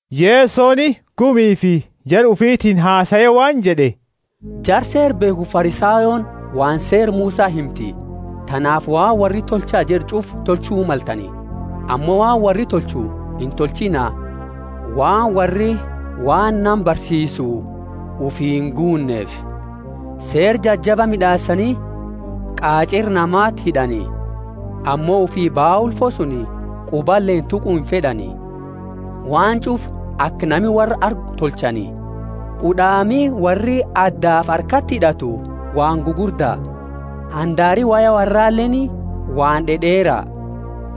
Yesoni gumifi jara ufitiini hasae waan jed'e, Jara Seera beekhufi Farisayooni waan Seera Musa himti. Tanaafi waan worri tolcha jed'u ch'ufa tolchu maltani, ammo waan worri tolchu intolchiina, waan worri waan nama barsiisu ufii inguunneefi. Seera jajaba mid'aasani qach'eera namati hid'ani, ammo ufii baa ulfo suni qubaleeni tuqu imfed'ani. Waan ch'ufa aka nami worra argu tolchani. Qud'aami worri addafi harkati hid'atu waan gugurda, handaari woya worraleeni waan d'ed'eera.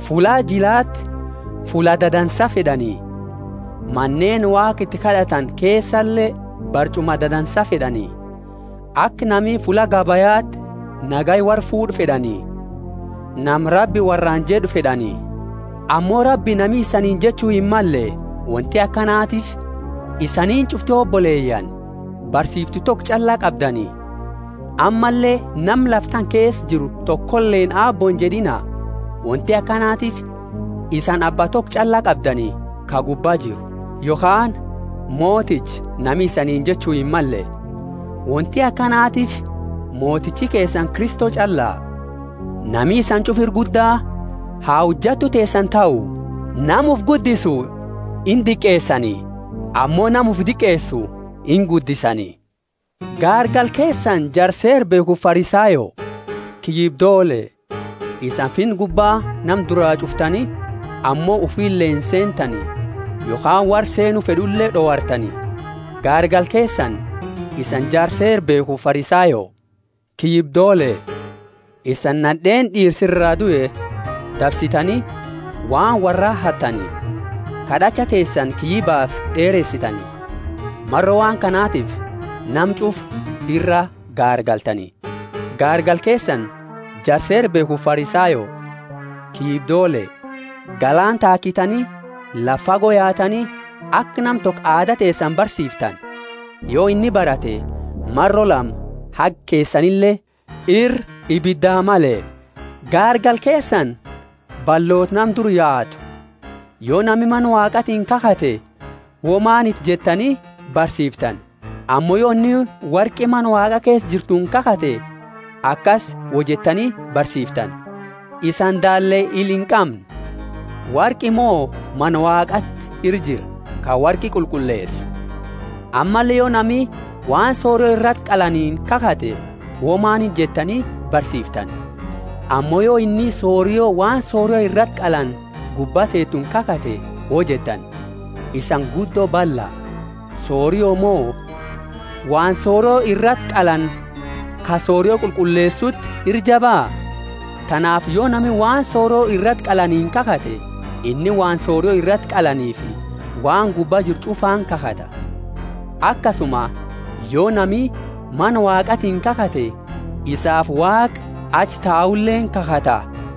Fulla jilati fulla dadansa fed'ani, maneeni Waaqa iti kad'atani keesale barch'uma dadansa fed'ani. Aka nami fulla gabayati nagaya worra fuud'u fed'ani, nama Rabbi worraani jed'u fed'ani. Ammo Rabbi nami isaniini jechu himmalle, wonti akanatiifi isaniini ch'ufti oboleyaani, barsiiftu toko ch'alla qabdani. Ammalle nama lafa tana keesa jiru tokoleeni Aabbo injed'ina; wonti akanatiifi isani Abba toko ch'alla qabdani, ka gubba jiru. Yokhaani Moticha nami isaniini jechu himmalle; wonti akanatiifi motichi keesani Kristo ch'alla. Nami isani ch'ufa ira gudda ha hojattu teesani tahu. Nama ufi guddisu indiqeesani, ammo nama ufi diqeesu inguddisani. Gaargala keesani jara Seera beekhufi Farisayo! Kiyyibdoole! Isani Finna gubba nama duraa ch'uftani, ammo ufile inseentani, yokhaani worra seennu fed'ule d'owartani. [ Gaargala keesani, isani jara Seera beekhufi Farisayo! Kiyyibdoole! Isani nad'eeni d'iirsi iraa due dabsitani, waan worra hattani, kad'acha teesani kiyyibafi d'eersetani. Maro waan kanatifi nama ch'ufa ira gaargaltani.] Gaargala keesani, jara Seera beekhufi Farisayo! Kiyyibdoole! Galaana taakitani, lafa fago yaatani, aka nama toko aada teesani barsiiftani; yo inni barate, maro lama haga keesanile ira ibidaa male! Gaargala keesani, balloota nama dura yaatu! Yo nami Mana Waaqatiini kakhate womaniti jettani barsiiftani; ammo yo inni worqi Mana Waaqa keesa jirtuuni kakhate akasi woi jettani barsiiftani. Isaani daalle ila inqamne! Worqi mo Mana Waaqaati ira jira, ka worqi qulqulleesu? Ammalle yo nami waan sorio irati qalanini kakhate, womaniti jettani barsiiftani, ammo yo inni sorio waan sorio irati qalani gubba teetuni kakhate woi jettani. Isani guddo balla! Sorio mo waan sorio irati qalani ka sorio qulqulleesuti ira jaba? Tanaafi yo nami waan sorio irati qalanini kakhate, inni waan sorio irati qalaniifi waan gubba jiru ch'ufaani kakhata; akasuma yo nami Mana Waaqatiini kakhate, isaafi Waaqa achi tauleeni kakhata;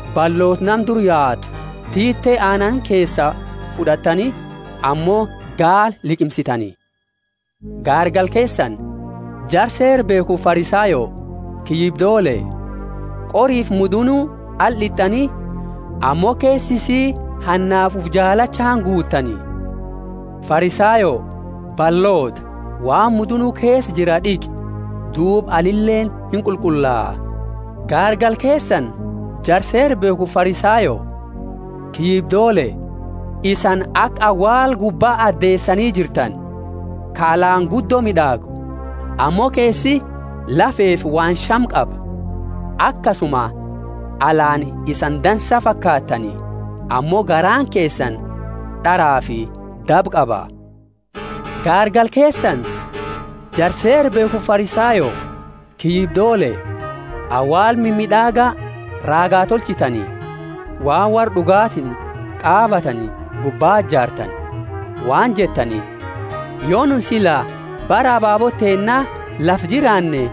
Balloota, nama dura yaatu! Tiite aanani keesaa fud'attani, ammo gaala liqimsitani! Gaargala keesani, jara Seera beekhufi Farisayo! Kiyyibdoole! Qorifi mudunu ala d'it'ani, ammo keesa isii hannafi ufi jaalachaani guutani. Farisayo balloota! Waan mudunu keesa jira d'iqi, duuba alileeni inqulqullaa. Gaargala keesani, jara Seera beekhufi Farisayo! Kiyyibdoole! Isani aka awaala gubbaa adeesani jirtani, ka alaani guddo mid'aagu, ammo keesi lafefi waan shame qaba. Akasuma alaani isani dansaa fakaattani, ammo garaani keesani d'arafi daba qaba. Gaargala keesani, jara Seera beekhufi Farisayo! Kiyyibdoole! Awaala mimid'aaga raagaa tolchitani, waan worra d'ugatiini qaabatani gubbaa jaartani, waan jettani, Yo nu sila bara ababoota teenna lafa jiraanne,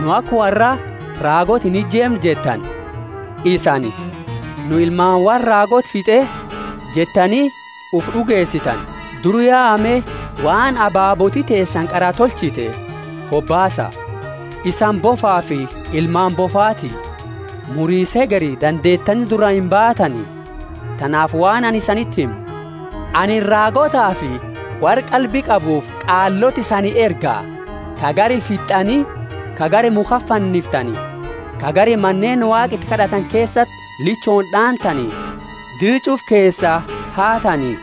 nu aka worraa raagoota inijeemnu jettani. Isani, Nu ilmaani worra raagoota fit'e jettani ufi d'ugeesitani. Dura yaa me, waan ababooti teesani qara tolchite hobaasa. Isani bofafi ilmaani bofaati! Murisa hegeri dandeetani duraa imbaatani. Tanaafi waan anini isaniti himu: Anini raagootafi worra qalbi qabuufi qaaloota isani erga; ka gari fitt'ani, ka gari mukhati fanniftani, ka gari Maneeni Waaqa iti kad'atani keesati lichooni d'aantani, dira ch'ufa keesaa haatani.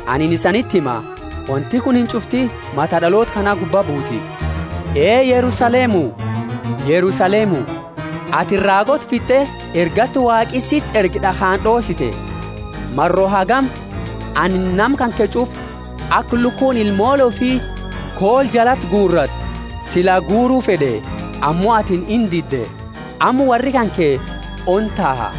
Anini isaniti hima, wonti kunini ch'ufti mata d'aloota kana gubba buuti. Ee Yerusalemu, Yerusalemu, atini raagoota fitt'e ergattu Waaqi siti erge d'akhaani d'oossite. Maro hagami anini nama kanke ch'ufa, aka lukuuni ilmoole ufi koola jalati guuratu sila guuru fed'e, ammo atini indidde. Amma worri kanke ona taha.